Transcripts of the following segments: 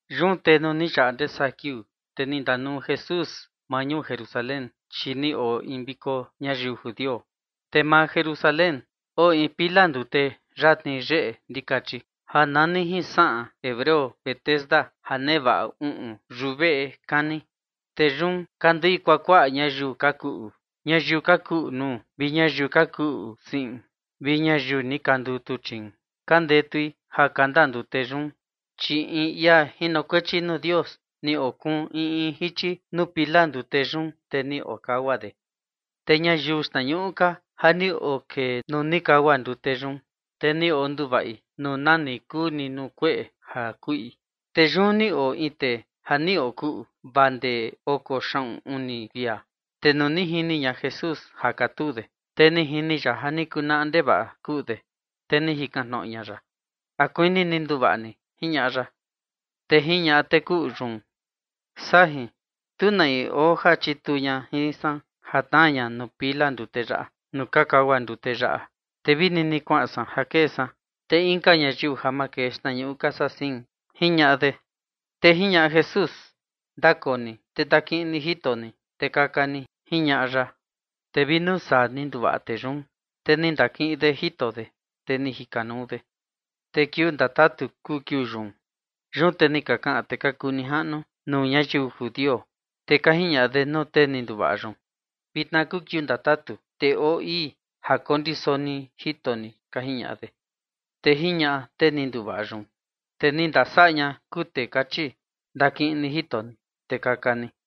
Yun te nuu ni yaꞌa ndee saa kiuu, te ni ndanuu Jesús maa ñuu Jerusalén, chi ni oo in viko ñayiu judio. Te maa Jerusalén oo in pila ndute yatni yeꞌe ndikachi, ja nani jin saꞌan hebreo Betesda ja nevaꞌa uꞌun yuveꞌe kani. Te yun ka nduei kuakuaꞌa ñayiu ka kuꞌu, ñayiu ka kuꞌu nuu vi ñayiu ka kuꞌu siꞌin vi ñayiu ni ka ndutuchiin, ka ndetui ja kanda ndute yun. (Chi in ia jinokuechi nuu Dios ni okuun in in jichi nuu pila ndute yun, te ni okagua de. Te ñayiu xtnañuꞌu ka ja ni okee nuu ni kagua ndute yun, te ni onduvaꞌi nuu nani kuu ni nuu kueꞌe ja kuꞌi.) Te yun ni oo in tee ja ni okuꞌu vaa ndee oko xaꞌun uni kuia. Te nuu ni jini ña Jesús ja katuu de, te ni jini ya ja ni kunaꞌa ndevaꞌa kuꞌu de, te ni jikan tnoꞌo ña ya: ―¿A kuini ni nduvaꞌa ni? ―jiñaꞌa ya. Te jiñaꞌa tee kuꞌu yun: ―Sajin, tu na in oo ja chituu ña jin san ja tnaa ña nuu pila ndute yaꞌa nuu ka kagua ndute yaꞌa, te vi nini kuaꞌan san ja kee san, te inka ñayiu ja makee xtnañuꞌu ka saa sein ―jiñaꞌa de. Te jiñaꞌa Jesús: ―Ndakoo ni te ndakiꞌin ni jito ni, te kaka ni ―jiñaꞌa ya. Te vi nuu saa ni nduvaꞌa tee yun, te ni ndakiꞌin de jito de, te ni jikanuu de. Te kiuu ndatatu kuu kiuu yun. Yun te ni ka kaꞌan tee ka kuu nijaꞌnu nuu ñayiu judio, te ka jiñaꞌa de nuu tee ni nduvaꞌa yun: ―Vitna kuu kiuu ndatatu, te oo ii ja kondiso ni jito ni ―ka jiñaꞌa de. Te jiñaꞌa tee ni nduvaꞌa yun: ―Tee ni ndasaꞌa ña kuu tee kachi: “Ndakiꞌin ni jito ni, te kaka ni”.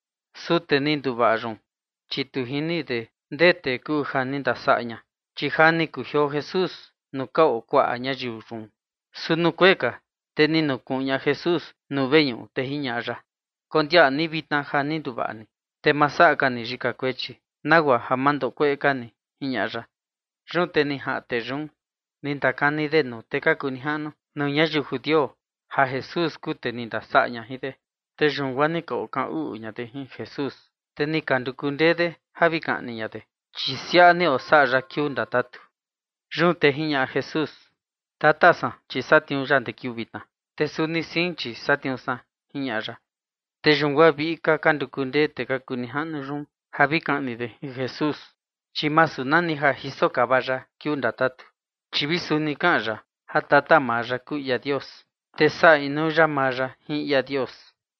Su tee ni nduvaꞌa yun, chi tu jini de ndee tee kuu ja ni ndasaꞌa ña, chi ja ni kujioo Jesús nuu ka oo kuaꞌa ñayiu yun. Su nuu kuee ka, te ni nukuꞌun ña Jesús nuu veñuꞌu, te jiñaꞌa ya: ―Kondiaꞌa ni vitna ja ni nduvaꞌa ni, te ma saꞌa ka ni yika kuechi, nagua ja ma ndoꞌo kueꞌe ka ni ―jiñaꞌa ya. Yun te ni jaꞌan tee yun, ni ndakani de nuu tee ka kuu nijaꞌnu nuu ñayiu judio ja Jesús kuu tee ni ndasaꞌa ña jin de. Te yun guaa ni ka okaꞌan uꞌu ña de jin Jesús, te ni ka nduku ndee de ja vi kaꞌni ña de, chi siaꞌa ni osaꞌa ya kiuu ndatatu. Yun te jiñaꞌa Jesús: ―Tata san, chi satniuu ya ndee kiuu vitna, te suni sein, chi satniuu san ―jiñaꞌa ya. Te yun guaa viꞌi ka ka nduku ndee tee ka kuu nijaꞌnu yun ja vi kaꞌni de Jesús, chi masu nani ja jisokava ya kiuu ndatatu, chi vi suni kaꞌan ya ja tata maa ya kuu ia Dios, te saꞌa inuu ya maa ya jin ia Dios.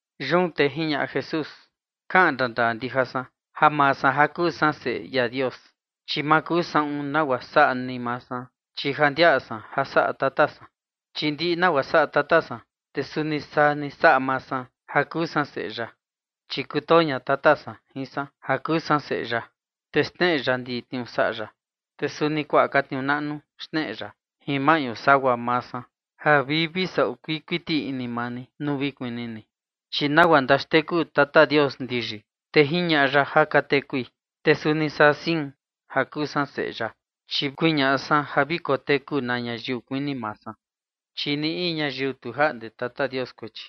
Yun te jiñaꞌa Jesús: ―Kaꞌan ndandaa ndija san ja maa san ja kuu san Seꞌe ia Dios, chi ma kuu saꞌun nagua saꞌa ni maa san, chi ja ndiaꞌa san ja saꞌa Tata san. Chi ndiꞌi nagua saꞌa Tata san, te suni saa ni saꞌa maa san ja kuu san Seꞌe ya. Chi kutoo ña Tata san jin san ja kuu san Seꞌe ya, te xneꞌe ya ndiꞌi tniuu saꞌa ya, te suni kuaꞌa ka tniuu naꞌnu xneꞌe ya jin maꞌñu sagua maa san, ja vi vi saꞌu kuii kuiti ini maa ni nuu vi kuni ni. Chi nagua ndaxteku Tata Dios ndiyi, te jiñaꞌa ya ja ka tekui, te suni saa ni sein, ja kuu san Seꞌe ya, chi kuñaꞌa san ja vi koteku na ñayiu kuini maa san. Chi ni in ñayiu tu jaꞌnde Tata Dios kuechi,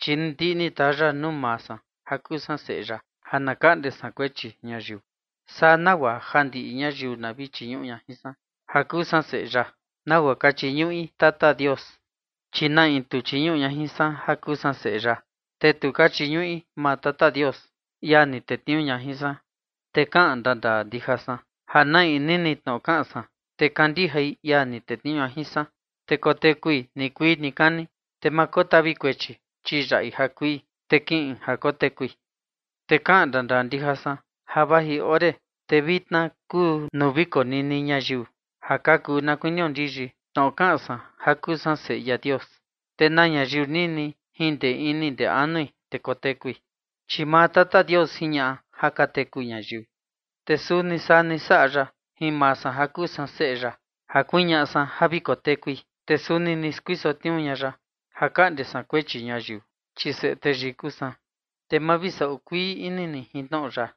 chi ndiꞌi ni taa ya nuu maa san ja kuu san Seꞌe ya ja na kaꞌnde san kuechi ñayiu. Saa nagua ja ndiꞌi ñayiu na vi chiñuꞌu ña jin san ja kuu san Seꞌe ya, nagua ka chiñuꞌi Tata Dios, chi na in tu chiñuꞌu ña jin san ja kuu san Seꞌe ya, te tu ka chiñuꞌi maa Tata Dios, ia ni tetniuu ña jin san. Te kaꞌan ndandaa ndija san ja na in nini tnoꞌo kaꞌan san, te kandijai ia ni tetniuu ña jin san, te kotekui nikuii nikani, te ma kotavi kuechi, chi yaꞌi ja kui, te kiꞌin ja kotekui. Te kaꞌan ndandaa ndija san ja vaji ore, te vitna kuu nuu vi konini ñayiu ja ka kuu na kuinio ndiyi tnoꞌo kaꞌan san ja kuu san Seꞌe ia Dios, te na ñayiu nini jin ndee ini ndee anui, te kotekui. Chi maa Tata Dios jiñaꞌa ja ka teku ñayiu, te suni saa ni saꞌa ya jin maa san ja kuu san Seꞌe ya ja kuñaꞌa san ja vi kotekui. Te suni ni skuiso tniuu ña ya ja kaꞌnde san kuechi ñayiu, chi Seꞌe Teyii kuu san. Te ma vi saꞌu kuii ini ni jin tnoꞌo yaꞌa,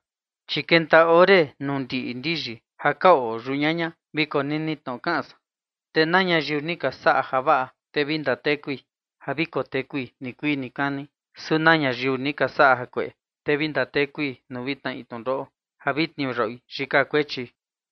chi kenta ore nuu ndiꞌi ndiyi ja ka oo yau ñaña vi konini tnoꞌo kaꞌan san. Te na ñayiu ni ka saꞌa javaꞌa, te vi ndatekui ja vi kotekui nikuii nikani. Su na ñayiu ni ka saꞌa jakueꞌe, te vi ndatekui nuu vi tnaꞌi tnundoꞌo ja vi tniuyaꞌui yika kuechi.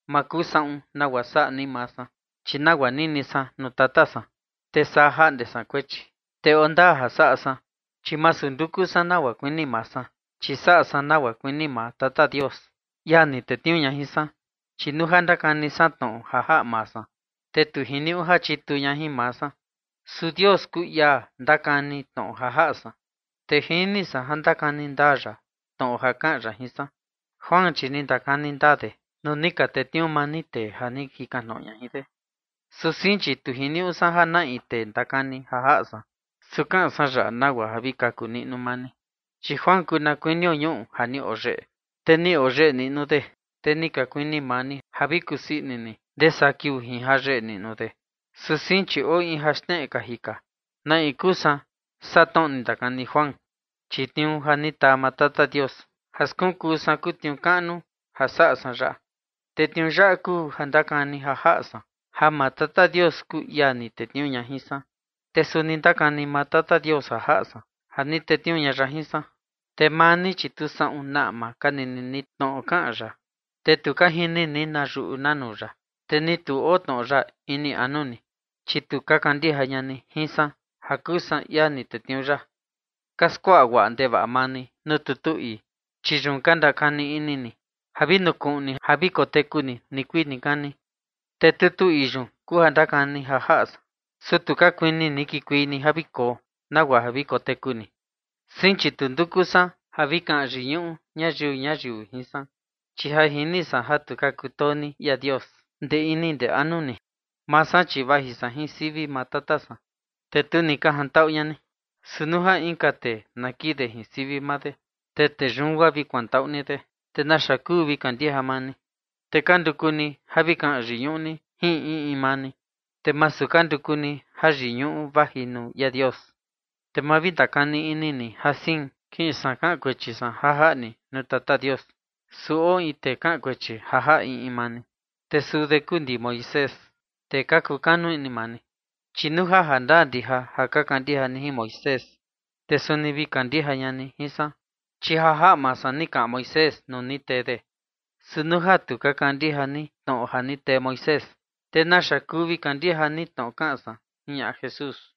’Ma kuu saꞌun nagua saꞌa ni maa san, chi nagua nini san nuu Tata san, te saa jaꞌnde san kuechi. Te oo ndaa ja saꞌa san, chi masu nduku san nagua kuini maa san, chi saꞌa san nagua kuini maa Tata Dios, ia ni tetniuu ña jin san. Chi nuu ja ndakani san tnoꞌo ja jaꞌa maa san, te tu jiniuꞌu ja chituu ña jin maa san. Su Dios kuu ia ndakani tnoꞌo ja jaꞌa san, te jini san ja ndakani ndaa ya tnoꞌo ja kaꞌan ya jin san. Juan, chi ni ndakani ndaa de nuu ni ka tetniuu maa ni tee ja ni ka jikan tnoꞌo ña jin de. Su sein, chi tu jiniuꞌu san ja na in tee ndakani ja jaꞌa san, su kaꞌan san yaꞌa nagua ja vi kaku niꞌnu maa ni. Chi Juan kuu na kuinio ñuꞌu ja ni oyeꞌe, te ni oyeꞌe niꞌnu de, te ni ka kuini maa ni ja vi kusii ini ni ndee saa kiuu jin jayeꞌe niꞌnu de. Su sein, chi oo in ja xneꞌe kaji ka na in kuu san saa tnoꞌo ni ndakani Juan, chi tniuu ja ni taa maa Tata Dios ja skunkuu san kuu tniuu kaꞌnu ja saꞌa san yaꞌa. Te tniuu yaꞌa kuu ja ndakani ja jaꞌa san, ja maa Tata Dios kuu ia ni tetniuu ña jin san. Te suni ndakani maa Tata Dios ja jaꞌa san, ja ni tetniuu ña ya jin san. Te maa ni, chi tu saꞌun na ama ka nini ni tnoꞌo kaꞌan ya, te ni tu ka jini ni na yuꞌu na nuu ya, te ni tu oo tnoꞌo ya ini anu ni, chi tu ka kandija ña ni jin san ja kuu san ia ni tetniuu ya. Ka skuaꞌa guaꞌa ndevaꞌa maa ni nuu tutu ii, chi yun ka ndakani ini ni ja vi nukuꞌun ni ja vi koteku ni nikuii nikani, te tutu ii yun kuu ja ndakani ja jaꞌa san. Su tu ka kuini ni kikuei ni ja vi koo, nagua ja vi koteku ni. ’Sein, chi tu nduku san ja vi kaꞌan yiñuꞌu ñayiu ñuyiu jin san. Chi ja jini san ja tu ka kutoo ni ia Dios ndee ini ndee anu ni. Maa san, chi vaji san jin sivi maa Tata san, te tu ni ka jantaꞌu ña ni, su nuu ja inka tee na kii de jin sivi maa de, te tee yun guaa vi kuantaꞌu ni de. ¿Te naxa kuu vi kandija maa ni? Te ka nduku ni ja vi kaꞌan yiñuꞌu ni jin in in maa ni, te masu ka nduku ni jayiñuꞌu vaji nuu ia Dios. Te ma vi ndakani ini ni ja sein kiꞌin san kaꞌan kuechi san ja jaꞌa ni nuu Tata Dios. Su oo in tee kaꞌan kuechi ja jaꞌa in in maa ni, te suu de kuu ndi Moisés, tee ka kukanu ini maa ni. Chi nuu ja jandaa ndija ja ka kandija ni Moisés, te suni vi kandija ña ni jin san, chi ja jaꞌa maa san ni kaꞌan Moisés nuu ni tee de. Su nuu ja tu ka kandija ni tnoꞌo ja ni tee Moisés, te ¿naxa kuu vi kandija ni tnoꞌo kaꞌan san? ―jiñaꞌa Jesús.